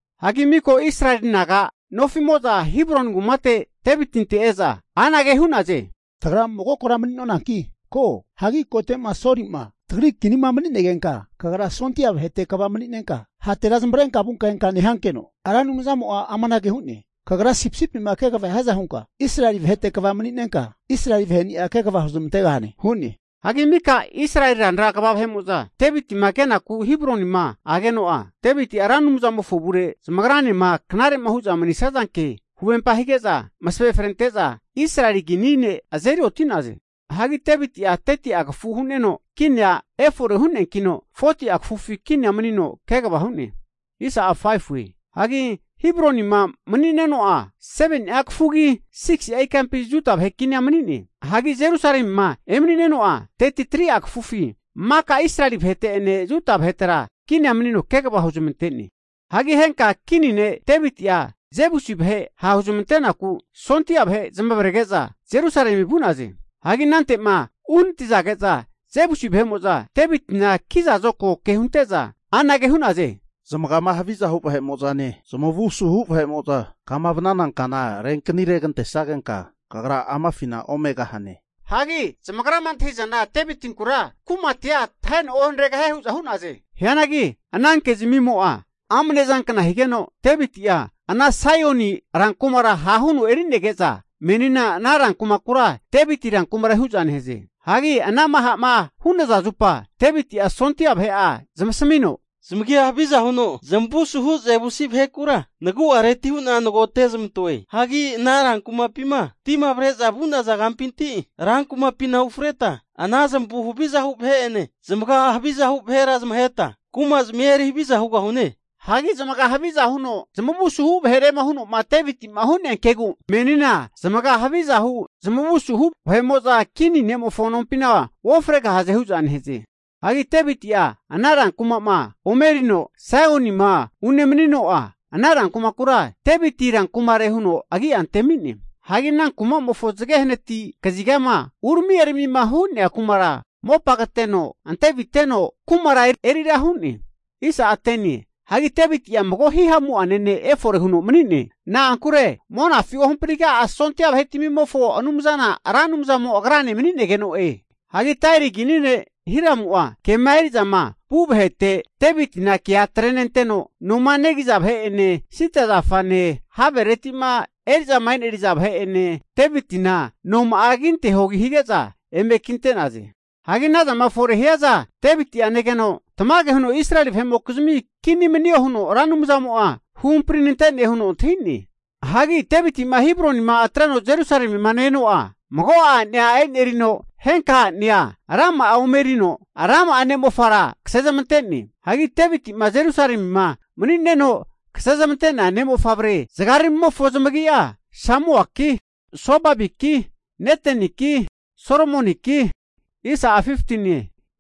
Hagi miko Israeli naga nofi'mo'za Hebroni kumate Devitinte e'za anage hu'naze, Tagra mago kora mani'nonanki ko. Hagi kote'ma Soli'ma tagri kinima mani'negenka kagra sondia vahete kva mani'nenka, hatera zamavarenka vunka enka nehankeno, Ra Anumzamo'a amanage hu'ne, Kagra sipisipima kegava hiaza hunka Israeli vahete kva mani'nenka, Israeli vahe'ni'a kegava huzmantegahane hu'ne. Hagi mika Israeli ranra kva vahe'mo'za Devitima kenaku Hebronima ageno'a, Deviti'a Ra Anumzamofo avure zamagranema knare'ma hu'za manisazanke huvempa hige'za, masave frente'za Israeli kini ne' azeri oti'naze. Hagi Deviti'a 30'a kafu hu'neno kinia efore hu'neankino, 40'a kafufi kinia manino kegava hu'ne. Hagi Hebronima mani'neno'a, 7ni'a kafugi 6'a ikampi Juda vahe kinia mani'ne. Hagi Jerusalemima emani'neno'a 33'a kafufi maka Israeli vahete'ene Juda vahetera kinia manino kegava huzmante'ne. Hagi henka kini ne' Deviti'a Jebusi vahe ha' huzamantenaku sondia vahe zamavarege'za Jerusalemi vu'naze. Hagi anante'ma uhanatizage'za Jebusi vahe'mo'za Devitina kiza zokago ke hunte'za anage hu'naze, Zamagama haviza hu vahe'mo'zane zamavu asuhu vahe'mo'za kama vanana kana renkani regante'sagenka kagra amafina omegahane. Hagi zamagrama antahi'zana Devitinkura kumatia taheno ohaneregahie hu'za hu'naze. Hianagi ana kezamimo'a amne zankna higeno, Deviti'a Saioni rankumara ha' huno eri'nege'za menina ana rankumakura Deviti rankumare hu'za nehaze. Hagi anama ha'ma hu'naza zupa Deviti'a sondia vahe'a zmasamino, zamagia haviza huno, zamavu asuhu Jebusi vahekura nagu'areti hu'na nagote'zamantoe. Hagi ana rankumapima tima avre'za vu'naza kampinti rankumapina ufreta, ana zamavu havizahu vahe'ene, zamaga havizahu vahera zamaheta kumazamia eri haviza hugahune. Hagi zamaga haviza huno, zamavu suhu vahere huno'ma Deviti'ma hu'nea kegu, menina zamaga havizahu, zamavu asuhu vahe'mo'za kini ne'mofo nompina uofregahaze hu'za nehaze. Hagi Deviti'a ana rankuma'ma ome erino Saionima unemanino'a, ana kumakura Deviti rankumare huno agi'a antemi'ne. Hagi ana kumamofo zage hanati kazigama urami eramima hu'nea kumara mopa kateno anteviteno kumara erira hu'ne. Hagi Deviti'a mago hihamu'ane ne' efore huno mani'ne. Na'ankure monafi ohampriga'a sondia vahetamimofo Anumzana Ra Anumzamo agrane mani'negeno'e. Hagi Tairi kini ne' Hiramu'a kema eri'zama vu vahete Devitina kea atrenenteno, Noma negiza vahe'ene, sida zafane, havereti'ma eri'zama e'neri'za vahe'ene Devitina noma'a kinteho hige'za eme kinte'naze. Hagi anazama fore hiaza Deviti'a negeno, tamage huno Israeli vahe'mokizmi kini manio huno Ra Anumzamo'a huhampri nante'ne huno antahi'ne. Hagi Deviti'ma Hebronima atreno Jerusalemima ne-eno'a, mago'a a'nea e'nerino, henka a'nea rama'a ome erino rama'a ne'mofara kasezmante'ne. Hagi Deviti'ma Jerusalemima mani'neno kasezamante'nea ne' mofavre zagaramimofo zamagi'a, Samuaki, Sobabiki, Neteniki, Solomoniki,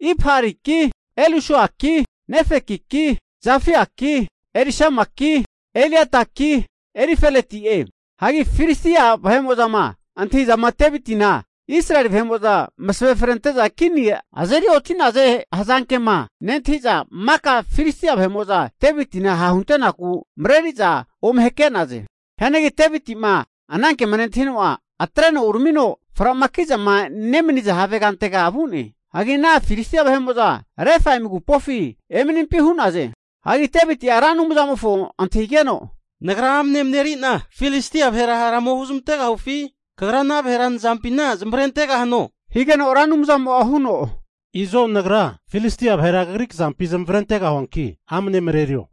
Ibhariki, Elisuaki Nefekiki, Jafiaki, Elisamaki, Eliadaki, Elifeleti'e. Hagi Filistia vahe'mo'zama antahizama Deviti'na Israeli vahe'mo'za masave frente'za kini azeri oti'naze hazankema nentahi'za, maka Filistia vahe'mo'za Devitina ha'hunte'naku mareri'za ome hake'naze. Hianagi Deviti'ma anankema nentahino'a, atreno uramino frama ki'zama nemaniza havegantega vu'ne. Hagi ana Filistia vahe'mo'za Refaimi agupofi emanimpi hu'naze. Hagi Deviti'a Ra Anumzamofo antahigeno, Nagra amane mareri'na Filistia vahera hara ome huzamantegahufi? Kagra ana vahera nazampina zamavarentegahano? Higeno Ra Anumzamo'a huno, Izo Nagra Filistia vahera kagri kazampi zamavarentegahuanki amne marerio.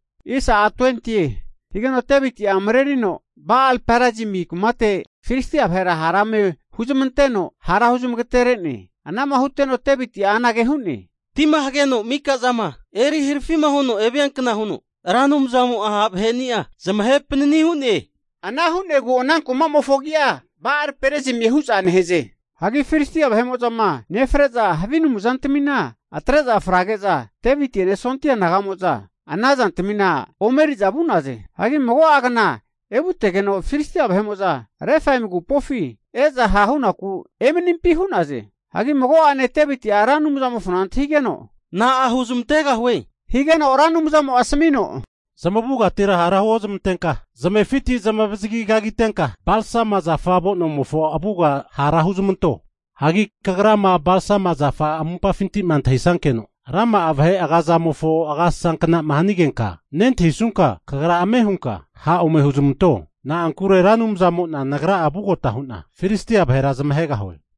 Higeno Deviti'a marerino Ba'al-Perazimi kumate Filistia vahera hara eme huzamanteno, hara huzamagatere'ne. Ana'ma huteno Deviti'a anage hu'ne, Tima hageno mika'zama eri harafi'ma huno eviankna huno Ra Anumzamo'a ha' vahe'ni'a zamahe panani hu'ne. Ana hu'negu ana kumamofo agi'a Ba'al Perazimie hu'za nehaze. Hagi Filistia vahe'mo'zama nefre'za havi anumzantamina atre'za frage'za, Deviti'ene sondi'a naga'amo'za ana zantamina ome eri'za vu'naze. Hagi mago'agna evutegeno, Filistia vahe'mo'za Refaimi agupofi e'za hahunaku emanimpi hu'naze. Hagi mago'ane Deviti'a Ra Anumzamofona antahigeno, Na'a huzamantegahue, higeno Ra Anumzamo'a asamino, zamavugatira hara huozmantenka, zamefiti zamavazagi kagitenka balsama zafa avo'nomofo avuga hara huzamanto. Hagi kagrama balsama zafa amumpafintima antahisankeno rama'a vahe agazamofo agasasa knama hanigenka, nentahisunka kagra ame hunka ha' ome huzamanto. Na'ankure Ra Anumzamo'na nagra'a vugota hu'na Filistia vahera zamahegahue.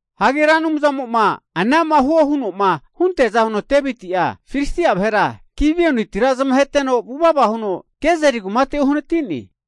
Hagi Ra Anumzamo'ma anama huo huno'ma hunteaza huno Deviti'a Filistia vahera Gibionitira zamaheteno vuvava huno Gezeri kumate uhanati'ne.